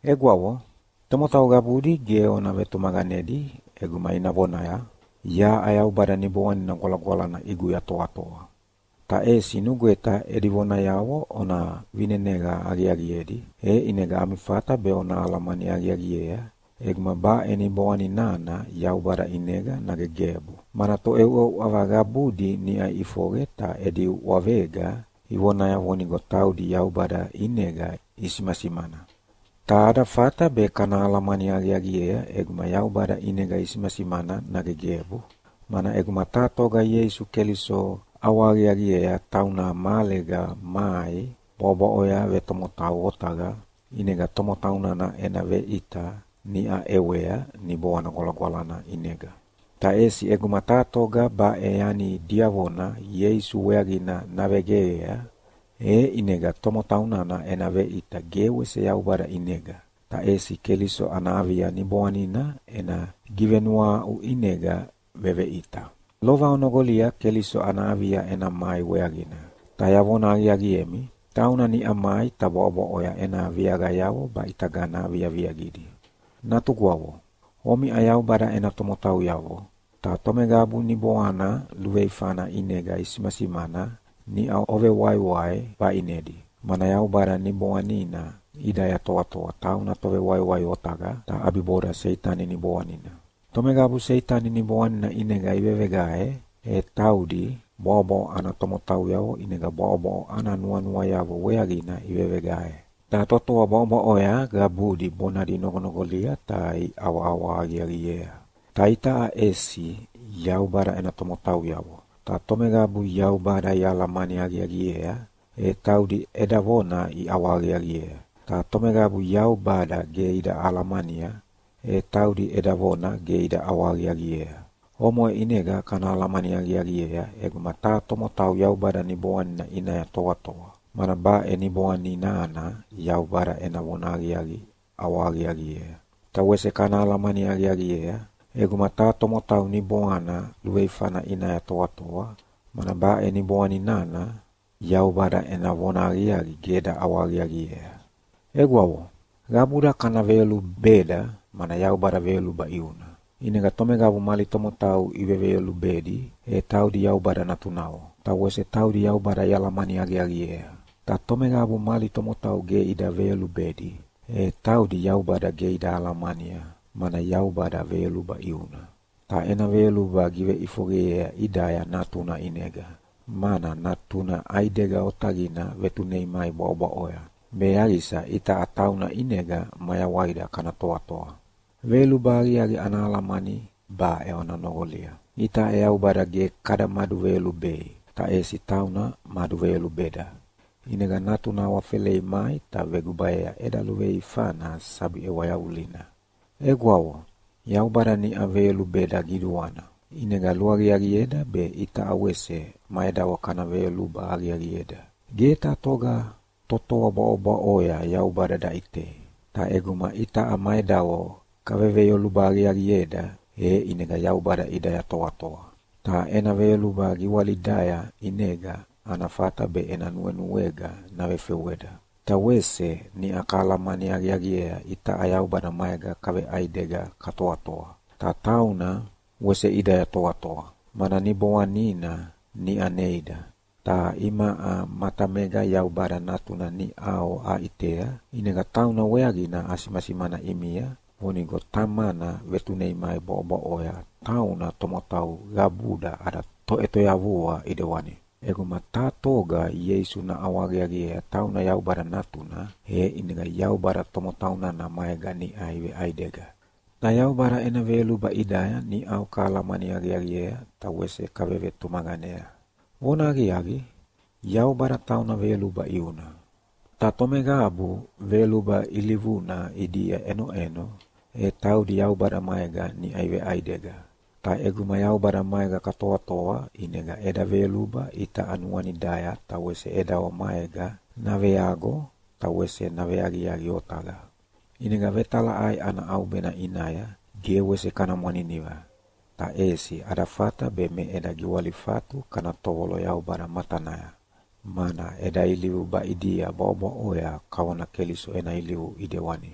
Egwavo, tomotau qabudi ge ona vetumaqanedi ʼeguma ina vonaya, “Yaʼa Yaubada Niboanina Gwalagwalana ʼiguya toatoa.” Ta ʼesi nugweta edi vonayavo ona vineneqa aqiaqiedi, e ʼinega ami fata be ona alamani aqiaqiea ʼeguma baʼe niboani nana Yaubada ʼinega nage gebu, mana toʼeuʼauʼava qabudi niʼa iʼifoqe ta edi uʼavega ivonaya vonigo taudi Yaubada ʼinega isimasimana. Ta ada fata be kana alamani aqiaqiea ʼeguma Yaubada ʼinega isimasimana nage gebu, mana ʼeguma taha toga Ieisu Keliso ʼawahaqiaqiea tauna mahalega mai bwaʼobwaʼoya vetomotau otaqa, ʼinega tomotau nana ena veʼita niʼa ʼewea Niboana Gwalagwalana ʼinega. Ta ʼesi ʼeguma taha toga baʼe yani diavona Ieisu weaqina navegeqea, e ʼinega tomotau nana ena veʼita ge wese Yaubada ʼinega, ta ʼesi Keliso ana avia niboanina ena givenuahaʼu ʼinega veveʼita. Lova onoqolia Keliso ana avia ena mai weaqina, ta yavona aqiaqiemi, tauna niʼa mai ta bwaʼobwaʼoya ena viaqayavo baʼitagana viaviaqidi. Natugwavo, omiʼa Yaubada ena tomotauyavo, ta tomeqabu niboana luveifana ʼinega isimasimana niʼa ovewaiwai vaʼinedi, mana Yaubada Niboanina ʼidaya toatoa tauna Tovewaiwai otaqa, ta ʼabiboda Seitani niboanina. Tomeqabu Seitani niboanina ʼinega iveveqae, e taudi bwaʼobwaʼo ana tomotauyavo ʼinega bwaʼobwaʼo ana nuanuayavo weaqina iveveqae, ta totoa bwaʼobwaʼoya qabudi bonadi inoqonoqolia ta iʼawaʼawa aqiaqiea. Ta itaʼa ʼesi Yaubada ena tomotauyavo, ta tomeqabu Yaubada ialamani aqiaqiea e taudi eda vona iʼawahaqiaqiea. Ta tomeqabu Yaubada ge ida alamania, e taudi eda vona ge ida ʼawahaqiaqiea. Omoʼe ʼinega kana alamani aqiaqiea ʼeguma taha tomotau Yaubada Niboanina ʼinaya toatoa, mana baʼe Niboani nana Yaubada ena vonahaqiaqi ʼawahaqiaqiea. Ta wese kana alamani aqiaqiea ʼeguma taha tomotau niboana luveifana ʼinaya toatoa, mana baʼe niboani nana Yaubada ena vonahaqiaqi ge daʼawahaqiaqiea. Egwavo, qabuda kana veyolubeda, mana Yaubada veyoluba ʼiuna. ʼInega tomeqabu mali tomotau iveveyolubedi, e taudi Yaubada natunavo, ta wese taudi Yaubada ialamani aqiaqiea. Ta tomeqabu mali tomotau ge ida veyolubedi, e taudi Yaubada ge ida alamania, mana Yaubada veyoluba ʼiuna. Ta ena veyoluba giveʼifoqeyea ʼidaya Natuna ʼinega, mana Natuna ʼaidega otaqina vetunei mai bwaʼobwaʼoya, be yaqisa itaʼa tauna ʼinega mayawaida kana toatoa. Veyoluba aqiaqi ana alamani baʼe ona noqolia: Itaʼa Yaubada ge kada maduveyolubei, ta ʼesi tauna maduveyolubeda, ʼinega Natuna awafelei mai ta vegubayea eda luveifana sabi ʼewa yavulina. Egwavo, Yaubada niʼa veyolubeda qiduana, ʼinega luaqiaqieda be itaʼa wese ma edavo kana veyoluba aqiaqieda. Ge taha toga totoa bwaʼobwaʼoya Yaubada daʼitea. Ta ʼeguma itaʼa ma edavo kaveveyoluba aqiaqieda, e ʼinega Yaubada ʼidaya toatoa. Ta ena veyoluba giwalidaya ʼinega ana fata be ena nuenuega navefeweda. Ta wese niʼa kahalamani aqiaqiea itaʼa Yaubada maega kaveʼaidega katoatoa, ta tauna wese ʼidaya toatoa, mana Niboanina niʼa neida. Ta imaʼa matamega Yaubada Natuna niʼau aʼitea, ʼinega tauna weaqina asimasimana ʼimia vonigo Tamana vetunei mai bwaʼobwaʼoya tauna tomotau qabuda ada Toʼetoyavua ʼidewani. ʼEguma taha toga Ieisu naʼawahaqiaqiea tauna Yaubada Natuna, e ʼinega Yaubada tomotau nana maega niʼa iveʼaidega. Ta Yaubada ena veyoluba ʼidaya niʼau kahalamani aqiaqiea ta wese kavevetumaqanea. Vonahaqiaqi, Yaubada tauna veyoluba ʼiuna. Ta tomeqabu veyoluba ilivuna ʼidia ʼenoʼeno, e taudi Yaubada maega niʼa iveʼaidega. Ta ʼeguma Yaubada maega katoatoa ʼinega eda veyoluba itaʼa nuanidaya ta wese edavo maega naveago ta wese naveaqiaqi otaqa. ʼInega vetalaʼai ana ʼaubena ʼinaya ge wese kana mwaniniva, ta ʼesi ada fata be me eda giwalifatu kana tovolo Yaubada matanaya, mana eda ilivu baʼidia bwaʼobwaʼoya kavona Keliso ena ilivu ʼidewani.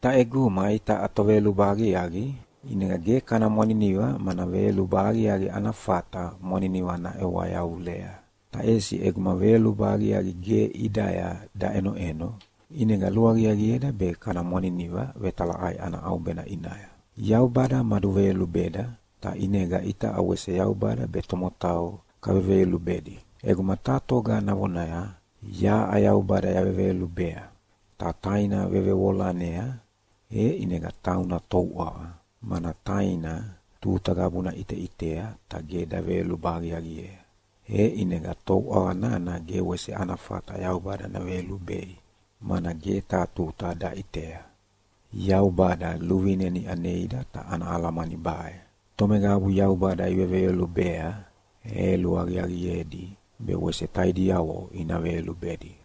Ta ʼeguma itaʼa toveyoluba aqiaqi, ʼinega ge kana mwaniniva mana veyoluba aqiaqi ana fata mwaniniva naʼewa yavulea. Ta ʼesi ʼeguma veyoluba aqiaqi ge ʼidaya daʼenoʼeno, ʼinega luaqiaqieda be kana mwaniniva vetalaʼai ana ʼaubena ʼinaya. Yaubada maduveyolubeda ta ʼinega itaʼa wese Yaubada be tomotau kaveveyolubedi. ʼEguma taha toga navonaya, “Yaʼa Yaubada yaveveyolubea!” ta taina vevevoalanea, e ʼinega tauna touʼava, mana taina tuta qabuna ʼiteʼitea ta ge daveyoluba aqiaqiea, e ʼinega touʼava nana ge wese ana fata Yaubada naveyolubei, mana ge taha tuta daʼitea. Yaubada luvine niʼa neida ta ana alamani baʼe: Tomeqabu Yaubada iveveyolubea, e luaqiaqiedi be wese taidiavo ina veyolubedi.